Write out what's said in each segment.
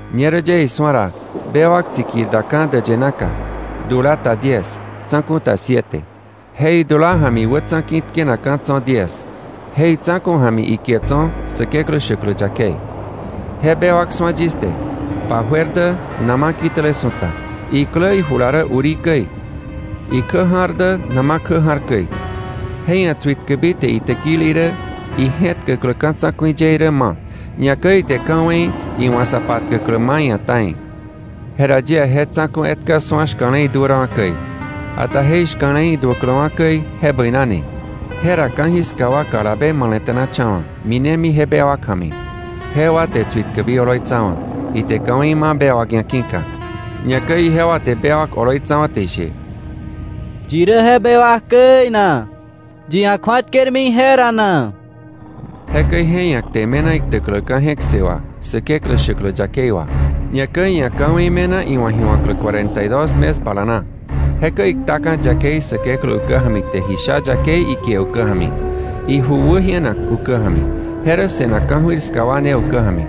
Ñerä yie isu̱a ra, bewak tsikir daka̱ däyë naka, dula ta diez, tsa̱ku̱ ta siete; je idula ja̱mi wätsa̱ ki̱ tkenakka̱ tso̱ diez, je itsa̱ku̱ ja̱mi ikie tso̱ Säkeklä shäklä yakei. Je bewak su̱a yis te, pa juer dä nama kitäle su̱ta, iklä ijula rä urí käi, ikjä ja̱r dä nama kjä ja̱r käi. Je ia̱ tsuitkäbi te itäkili irä, ije̱tkäklä ka̱ tsa̱ku̱i ye irä ma̱, ñakäi ite ka̱wei iwa̱ sa patkäklä ma̱ iia̱ ta̱i. Jera yie je tsa̱ku̱ etka su̱a shka̱le iduärawa̱ käi, ata je ishka̱le iduäkläwa̱ käi je bäinani. Jera ka̱jiska wa kalabe male̱te̱nacha̱wa̱, minemi je bewak ja̱mi. Jewa te tsuitkäbi oloitsawa̱, ite ka̱wei ma bewak ia̱ ki̱ka. Ñakäi ijewa te bewak oloitsawa̱ te ishe: “¿Yi rä je bewak käi na? ¿Yi ia̱ kju̱atkermi ije ra na?” Jekäi je ia̱ kte me̱na iktäkläka̱ je̱k ssë wà, Säkeklä shäklä yakei wà. Ñakäi iia̱ ka̱wei me̱na iwa̱ ji wa̱klä cuarenta y dos mes bala na. Jekäi iktaka̱ yakei Säkeklä ukä ja̱mi te ji sha yakei ikie ukä ja̱mi, iju wäjienak ukä ja̱mi, je rä se̱nak ka̱jöir ska wa ne ukä ja̱mi.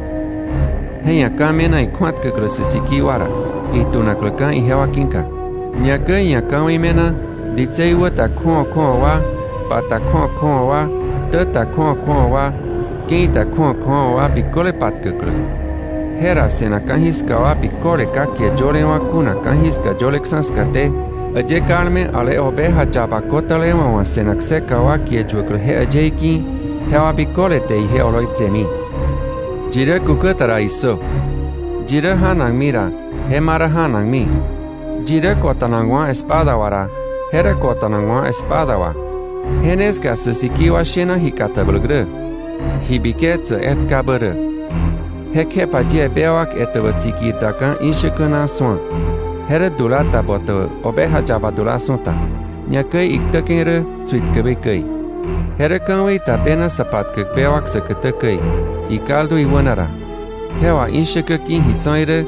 Je ia̱ ka̱ me̱na ikju̱atkäklä sä sikii wa ra, itunakläka̱ ijewa ki̱ka. Ñakäi iia̱ ka̱wei me̱na, ditsei wä ta kju̱awa kju̱awa wa, pa ta kju̱awa kju̱awa wa, ktä ta kju̱awa kju̱awa wa, ke̱i ta kju̱awa kju̱awa wa biköle patkäklä. Jera se̱nak ka̱jiska wa biköle ka kie yölewa̱ kuna ka̱jiska yöleksa̱ skaté, äyë kalme ale Oveja yaba ko̱tälewa̱ wa̱ se̱nak kseka wa kie yuäklä je äyëí ki̱, jewa biköle te ije oloitsemi. ¡Yi rä kukä ta ra, issö! “Yi rä janakmi ra, je ma rä janakmi, yi rä ko̱ta̱nakwa̱ espada wà ra, je rä ko̱ta̱nakwa̱ espada wà.” Je ne ska sä sikii wa shena ji katabläk rä, ji biketsäk etkabä rä. Jekjepa yie bewak etäbä tsikir daka̱ ishäkä na su̱a; je rä dula ta botäbä oveja yaba dula su̱ta, ñakäi iktäke̱ rä tsuitkäbi käi. Je rä ka̱wei ta bena sa patkäk bewak säkätä käi, ikaldu iwäna ra. Je wà ishäkä ki̱ ji tso̱ irä,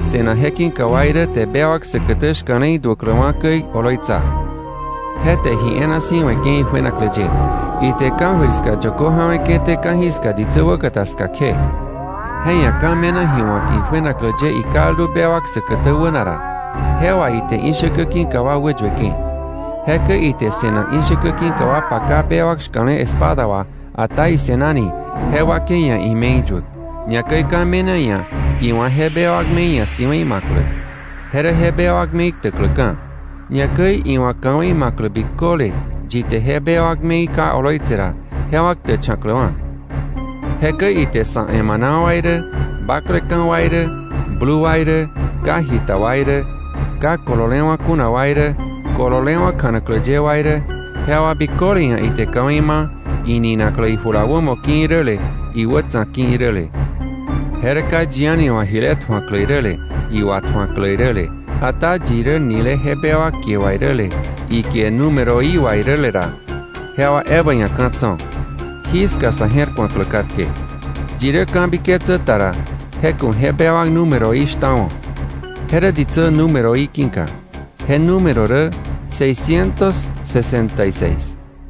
se̱nak je ki̱ka wa irä te bewak säkätä shka̱le iduäkläwa̱ käi oloitsa. Je te ji e̱e̱na si̱ we̱ke̱ ijuenaklä ye, ite ka̱jöir ska yökö ja̱we̱ke̱té ka̱jiska ditsä wäkata ska kje. Je ia̱ ka̱ me̱na ji wa̱k ijuenaklä ye ikaldu bewak säkätä wäna ra, je wà ite ishäkä ki̱ka wa wäyueke̱. Jekäi ite se̱nak ishäkä ki̱ka wa paka bewak shka̱le espada wà, ata ise̱nani, je wakei ia̱ ime̱i yuäk. Ñakäi ka̱ me̱na iia̱ iwa̱ je bewak me̱i ia̱ si̱we̱i ma̱klä, je rä je bewak me̱i ktäkläka̱, ñakäi iwa̱ ka̱wei ma̱klä biköle yi te je bewak me̱i ka oloitse ra, jewa ktächa̱kläwa̱. Jekäi ite sa̱ emana wa irä, bakleka̱ wa irä, blu wa irä, ka jita wa irä, ka kololewa̱ kuna wa irä, kololewa̱ kjanaklä ye wa irä, jewa biköle ia̱ ite ka̱wei ma, ininaklä ijula wämo ki̱ iräle iwätsa̱ ki̱ iräle. Je rä ka yi a̱ni wa̱ jile tju̱aklä iräle iwatju̱aklä iräle, ata yi rä nile je bewak kie wà iräle, ikie númeroí wà iräle ra, jewa ebä ia̱ ka̱ tso̱. Jí ska sa̱ je̱r ku̱aklä katke. Yi rä ka̱biketsä ta ra, je ku̱ je bewak númeroí shtawo̱, je rä ditsä númeroí ki̱ka. Je número rä seiscientos sesenta y seis.